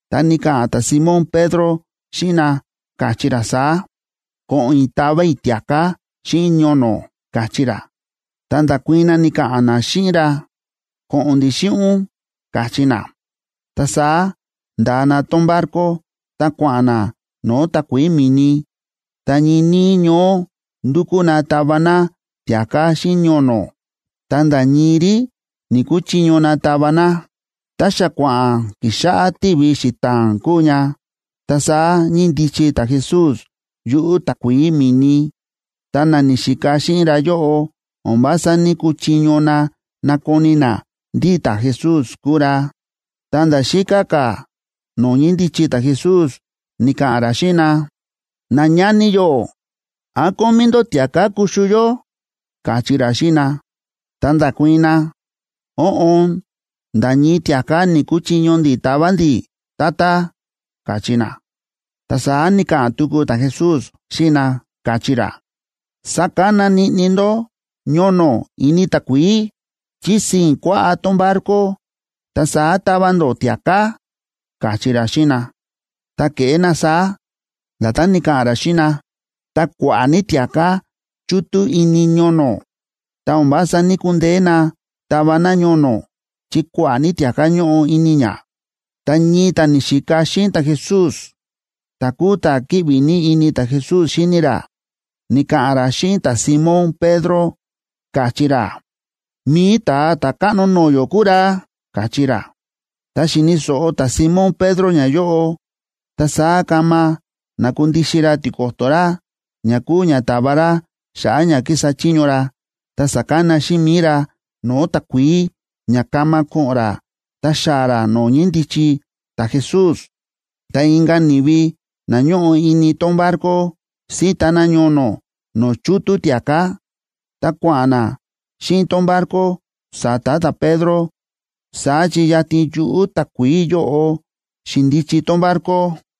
Ta ni̱ka̱ꞌa̱n ta̱Simón Pedro xíꞌin na, káchí ra saá: ―Ko̱ꞌo̱n i̱ tava i̱ tia̱ká xíꞌin ñono̱ ―káchí ra. Ta nda̱kuii̱n na, ni̱ka̱ꞌa̱n na xíꞌin ra: ―Ko̱ꞌo̱n ndi̱ xíꞌin ún ―káchí na. Ta saá nda̱a na tón barco, ta kua̱ꞌa̱n na no̱o̱ takuií mi̱ni. Ta ñii níí ñoó ndúkú na tava na tia̱ká xíꞌin ñono̱, ta nda̱ ñii rí ni̱‑kuchiño na tava na. Ta xa kua̱ꞌa̱n kixáꞌá tivi xita̱a̱n kúu ña, ta saá ñíndichi ta̱Jesús yuꞌu̱ takuií mi̱ni, ta na ni̱xika xíꞌin ra yóꞌo o̱n vása ní‑kuchiño na nakoni na ndí ta̱Jesús kúu ra. Ta nda̱ xíká ka̱ no̱o̱ ñíndichi ta̱Jesús, ni̱ka̱ꞌa̱n ra xíꞌin na: ―Nañani yó, ¿án kómí ndó tia̱ká kuxu yó? ―káchí ra xíꞌin na. Ta nda̱kuii̱n na: ―Óꞌon, nda̱ ñii tia̱ká ni̱‑kuchiño ndi̱ tava ndi̱, Tata ―káchí na. Ta saá ni̱ka̱ꞌa̱n tuku ta̱Jesús xíꞌin na, káchí ra: ―Sakana niꞌni ndó ñono̱ ini takuií, chí sii̱n kuaꞌá tón barco, ta saá tava ndó tia̱ká ―káchí ra xíꞌin na. Tá ke̱ꞌé na saá, nda̱tán ni̱ka̱ꞌa̱n ra xíꞌin na, ta kua̱ꞌa̱ ní tia̱ká chútú ini ñono̱, ta̱ o̱n vása ní‑kundeé na tava na ñono̱, chi kua̱ꞌa̱ ní tia̱ká ñóꞌo ini ña. Ta ñii ta̱ ni̱xika xíꞌin ta̱Jesús, ta̱ kúu ta̱ kíꞌvi ní ini ta̱Jesús xíni ra, ni̱ka̱ꞌa̱n ra xíꞌin ta̱Simón Pedro, káchí ra: ―¡Mi̱i Ta̱a Ta̱káꞌno no̱o̱ yó kúu ra! ―káchí ra. Tá xi̱ni̱ so̱ꞌo ta̱Simón Pedro ñayóꞌo, ta saá kama na̱kundixin ra tiko̱to̱ ra, ña kúu ña ta̱va ra xa̱ꞌa̱ ña ki̱sa chiño ra, ta sa̱kana xíꞌin mi̱i ra no̱o̱ takuií ña kama ko̱ꞌo̱n ra ta xaa̱ ra no̱o̱ ñíndichi ta̱Jesús. Ta inka̱ ni̱vi na ñóꞌo ini tón barco, síta na ñono̱ no̱o̱ chútú tia̱ká, ta kua̱ꞌa̱n na xíꞌin tón barco sa̱ta̱ ta̱Pedro. Saá chi yatin yuꞌu̱ takuií yóꞌo xi̱ndichi tón barco: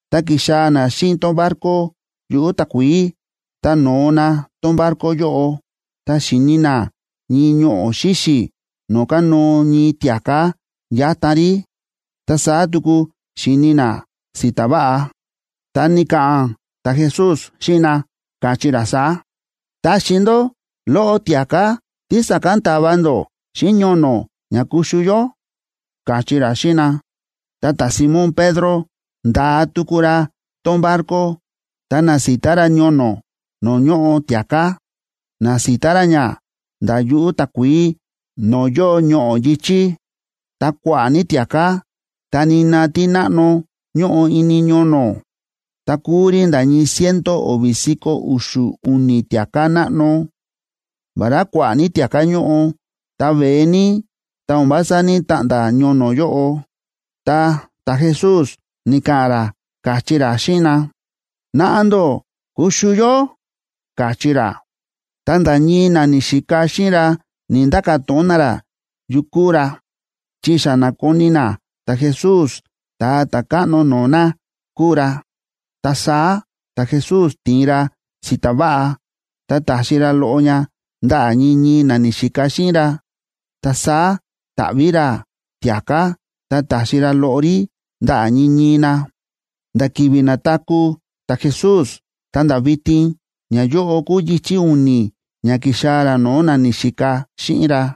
Tá ki̱xaa̱ na xíꞌin tón barco yuꞌu̱ takuií, ta no̱o na tón barco yóꞌo, ta xi̱ni na ñii ñoꞌo̱ xíxi̱ no̱o̱ kánóo ñii tia̱ká yátan rí, ta saá tuku xi̱ni na si̱ta̱ váꞌa. Ta ni̱ka̱ꞌa̱n ta̱Jesús xíꞌin na, káchí ra saá: ―Taxi ndó loꞌo tia̱ká tí sa̱kán ta̱va ndó xíꞌin ñono̱ ña kuxu yó ―káchí ra xíꞌin na. Ta ta̱Simón Pedro, nda̱a tuku ra tón barco, ta na̱sita ra ñono̱ no̱o̱ ñóꞌo tia̱ká, na̱sita ra ña nda̱ yuꞌu̱ takuií no̱o̱ yóo ñoꞌo̱ yi̱chí. Ta kua̱ꞌa̱ ní tia̱ká, ta nina tí náꞌno ñóꞌo ini ñono̱, ta kúu rí nda̱ ñii ciento o̱vi̱ si̱ko̱ u̱xu̱ u̱ni̱ tia̱ká náꞌno. Vará kua̱ꞌa̱ ní tia̱ká ñóꞌo, ta veé ní, ta o̱n vása ní‑taꞌnda̱ ñono̱ yóꞌo. Ta ta̱Jesús ni̱ka̱ꞌa̱n ra, káchí ra xíꞌin na: ―Naꞌa ndó kuxu yó ―káchí ra. Ta nda̱ ñii na ni̱xika xíꞌin ra ni̱‑nda̱ka̱ to̱ꞌon na ra yu kúu ra, chi xa na̱koni na ta̱Jesús, Ta̱a Ta̱káꞌno no̱o̱ na kúu ra. Ta saá ta̱Jesús ti̱in ra si̱ta̱ váꞌa, ta ta̱xi ra loꞌo ña ndaꞌa̱ ñii ñii na ni̱xika xíꞌin ra. Ta saá ta̱ꞌví ra tia̱ká, ta ta̱xi ra loꞌo rí ndaꞌa̱ ñii ñii na. Nda̱ ki̱vi̱ na̱taku̱ ta̱Jesús ta̱nda̱ vitin, ñayóꞌo kúu yichi̱ u̱ni̱ ña ki̱xaa̱ ra no̱o̱ na ni̱xika xíꞌin ra.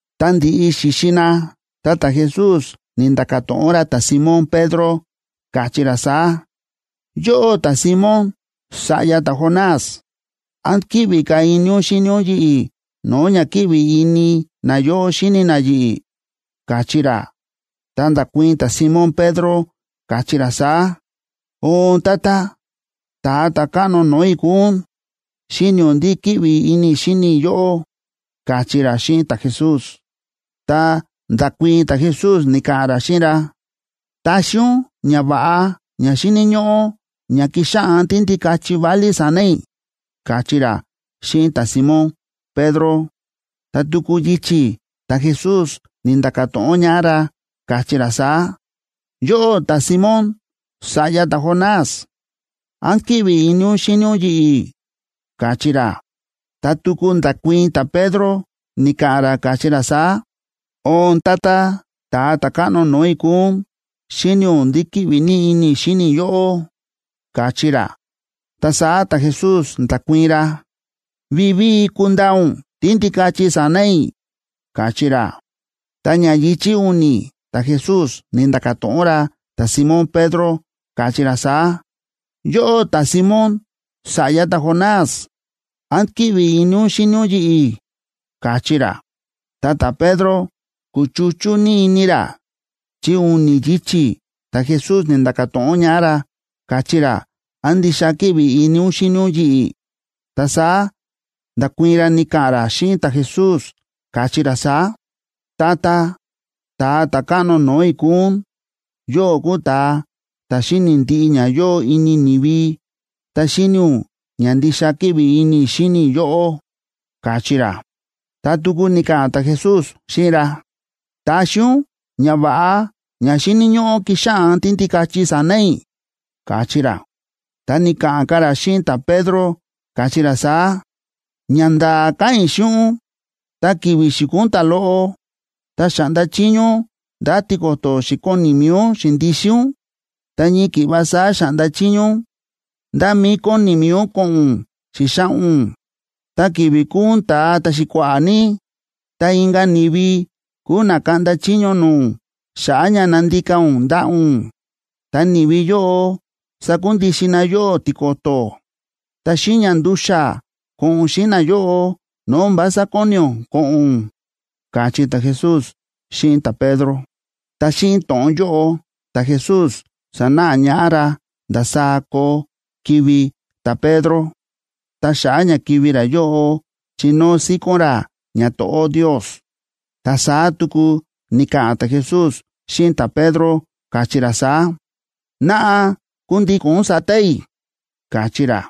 Tá ndi̱ꞌi xi̱xi na, ta ta̱Jesús ni̱nda̱ka̱ to̱ꞌon ra ta̱Simón Pedro, káchí ra saá: ―Yóꞌó ta̱Simón, sa̱ꞌya ta̱Jonás, ¿án kíꞌvi ka̱ ini ún xíni ún yi̱ꞌi̱ no̱o̱ ña kíꞌvi ini nayóꞌo xíni na yi̱ꞌi̱? ―káchí ra. Ta nda̱kuii̱n ta̱Simón Pedro, káchí ra saá: ―Oon, Tata, Ta̱a Ta̱káꞌno no̱o̱ i̱ kúu ún, xíni̱ ún ndí kíꞌvi ini i̱ xíni i̱ yóꞌó ―káchí ra xíꞌin ta̱Jesús. Ta nda̱kuii̱n ta̱Jesús, ni̱ka̱ꞌa̱n ra xíꞌin ra: ―Taxi ún ñava̱ꞌa ña xíni̱ ñóꞌó ña kixáꞌan tíndikachi válí sa̱na̱ i̱ ―káchí ra xíꞌin ta̱Simón Pedro. Ta tuku yichi̱ ta̱Jesús ni̱nda̱ka̱ to̱ꞌon ñaꞌá ra, káchí ra saá: ―Yóꞌó ta̱Simón, sa̱ꞌya ta̱Jonás, ¿án kíꞌvi ini ún xíni ún yi̱ꞌi̱? ―káchí ra. Ta tuku nda̱kuii̱n ta̱Pedro, ni̱ka̱ꞌa̱n ra, káchí ra saá: ―Oon, Tata, Ta̱a Ta̱káꞌno no̱o̱ i̱ kúu ún, xíni̱ ún ndí kíꞌvi ní ini i̱ xíni i̱ yóꞌó ―káchí ra. Ta saá ta̱Jesús nda̱kuii̱n ra: ―Vivíi kundaa ún tíndikachi sa̱na̱ i̱ ―káchí ra. Ta ña yichi̱ u̱ni̱ ta̱Jesús ni̱nda̱ka̱ to̱ꞌon ra ta̱Simón Pedro, káchí ra saá: ―Yóꞌó ta̱Simón, sa̱ꞌya ta̱Jonás, ¿án kíꞌvi ini ún xíni ún yi̱ꞌi̱? ―káchí ra. Ta ta̱Pedro kúchuchú ní ini ra, chi u̱ni̱ yichi̱ ta̱Jesús ni̱nda̱ka̱ to̱ꞌon ñaꞌá ra, káchí ra: “¿Án ndixa kíꞌvi ini ún xíni ún yi̱ꞌi̱?” Ta saá nda̱kuii̱n ra, ni̱ka̱ꞌa̱n ra xíꞌin ta̱Jesús, káchí ra saá: ―Tata, Ta̱a Ta̱káꞌno no̱o̱ i̱ kúu ún, yóꞌó kúu ta̱a ta̱ xíni̱ ndiꞌi ña yóo ini ni̱vi, ta xíni̱ ún ña ndixa kíꞌvi ini i̱ xíni i̱ yóꞌó ―káchí ra. Ta tuku ni̱ka̱ꞌa̱n ta̱Jesús xíꞌin ra: ―Taxi ún ñava̱ꞌa ña xíni̱ ñóꞌó kixáꞌan tíndikachi sa̱na̱ i̱ ―káchí ra. Ta ni̱ka̱ꞌa̱n ka̱ ra xíꞌin ta̱Pedro, káchí ra saá: ―Ñanda̱a̱ káꞌa̱n i̱ xíꞌin ún, tá ki̱vi̱ xi̱kuu ún ta̱loꞌo, ta xa̱ꞌnda chiño ún ndá tiko̱to̱ xi̱koni mi̱i ún xi̱ndixin ún, ta ñii ki̱ꞌva saá xa̱ꞌnda chiño ún ndá mí kóni mi̱i ún ko̱ꞌo̱n ún xi̱xaꞌa̱n ún. Ta ki̱vi̱ kuu ún ta̱a ta̱xi̱kua̱ꞌa̱ ní, ta inka̱ ni̱vi kuu na kaꞌnda chiño no̱o̱ ún xa̱ꞌa̱ ña nandika ún ndaꞌa̱ ún, ta ni̱vi yóꞌo sakundixin na yóꞌó tiko̱to̱, ta xíꞌin ña ndu̱xa̱ ko̱ꞌo̱n ún xíꞌin nayóꞌo no̱o̱ o̱n vása kóni ún ko̱ꞌo̱n ún ―káchí ta̱Jesús xíꞌin ta̱Pedro. Ta xíꞌin to̱ꞌon yóꞌo ta̱Jesús sa̱náꞌa ñaꞌá ra ndasaá koo kivi̱ ta̱Pedro, ta xa̱ꞌa̱ ña kivi̱ ra yóꞌo chinóo síkón ra ñato̱ꞌó Ndios. Ta saá tuku ni̱ka̱ꞌa̱n ta̱Jesús xíꞌin ta̱Pedro, káchí ra saá: ―Naꞌa, kundíko̱n ún sa̱ta̱ i̱ ―káchí ra.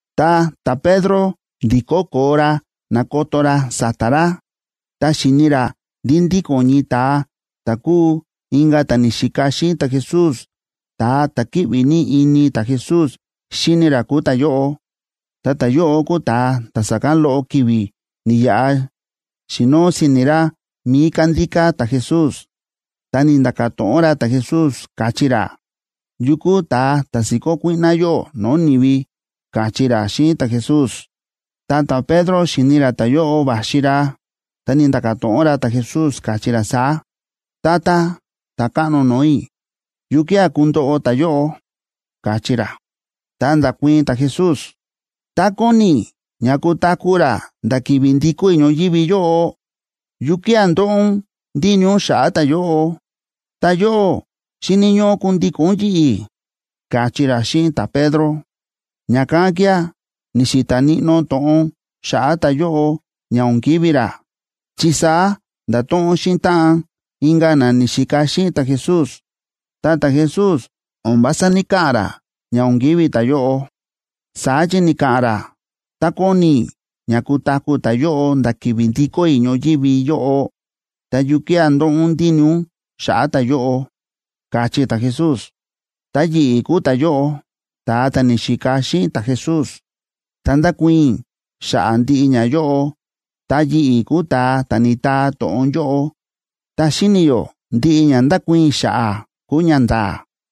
Ta ta̱Pedro ndi̱kó koo ra na̱koto ra sa̱ta̱ ra, ta xi̱ni ra ndí ndíko̱n ñii ta̱a ta̱ kúu inka̱ ta̱ ni̱xika xíꞌin ta̱Jesús, ta̱a ta̱ kíꞌvi ní ini ta̱Jesús xíni ra kúu ta̱yóꞌo. Ta ta̱yóꞌo kúu ta̱a ta̱ sa̱kán loꞌo ki̱vi̱ ni̱yaꞌa xi̱noo si̱ni̱ ra mi̱i kándíká ta̱Jesús, ta ni̱nda̱ka̱ to̱ꞌon ra ta̱Jesús, káchí ra: “¿Yu kúu ta̱a ta̱ si̱kó kuíꞌná yóꞌó no̱o̱ ni̱vi?”, káchí ra xíꞌin ta̱Jesús. Ta ta̱Pedro xi̱ni ra ta̱yóꞌo va̱xi ra, ta ni̱nda̱ka̱ to̱ꞌon ra ta̱Jesús, káchí ra saá: ―Tata, Ta̱káꞌno no̱o̱ i̱, ¿yukía̱ kundoꞌo ta̱yóꞌo? ―káchí ra. Ta nda̱kuii̱n ta̱Jesús: ―Tá kóni i̱ ña kutaku̱ ra nda̱ ki̱vi̱ ndikó i̱ ñoyívi yóꞌo, ¿yukía̱ ndóꞌo ún ndíni ún xa̱ꞌa̱ ta̱yóꞌo? Ta yóꞌó, xíni̱ ñóꞌó kundíko̱n ún yi̱ꞌi̱ ―káchí ra xíꞌin ta̱Pedro. Ña̱kán kía̱ ni̱xi̱ta̱ níꞌnó to̱ꞌon xa̱ꞌa̱ ta̱yóꞌo ña o̱n kivi̱ ra, chi saá nda̱to̱ꞌon xíꞌin táꞌan inka̱ na ni̱xika xíꞌin ta̱Jesús. Ta ta̱Jesús o̱n vása ní‑kaꞌa̱n ra ña o̱n kivi̱ ta̱yóꞌo. Saá chi ni̱ka̱ꞌa̱n ra: “Tá kóni i̱ ña kutaku̱ ta̱yóꞌo nda̱ ki̱vi̱ ndikó i̱ ñoyívi yóꞌo, ta, ¿yukía̱ ndóꞌo ún ndíni ún xa̱ꞌa̱ ta̱yóꞌo?”, káchí ta̱Jesús. Ta yi̱ꞌi̱ kúu ta̱yóꞌo, ta̱a ta̱ ni̱xika xíꞌin ta̱Jesús, ta ndákuii̱n i̱ xa̱ꞌa̱ ndiꞌi ñayóꞌo, ta yi̱ꞌi̱ kúu ta̱a ta̱ ni̱taa to̱ꞌon yóꞌo, ta xíni̱ yó ndiꞌi ña nda̱kuii̱n i̱ xa̱ꞌa̱ kúu ñanda̱a̱.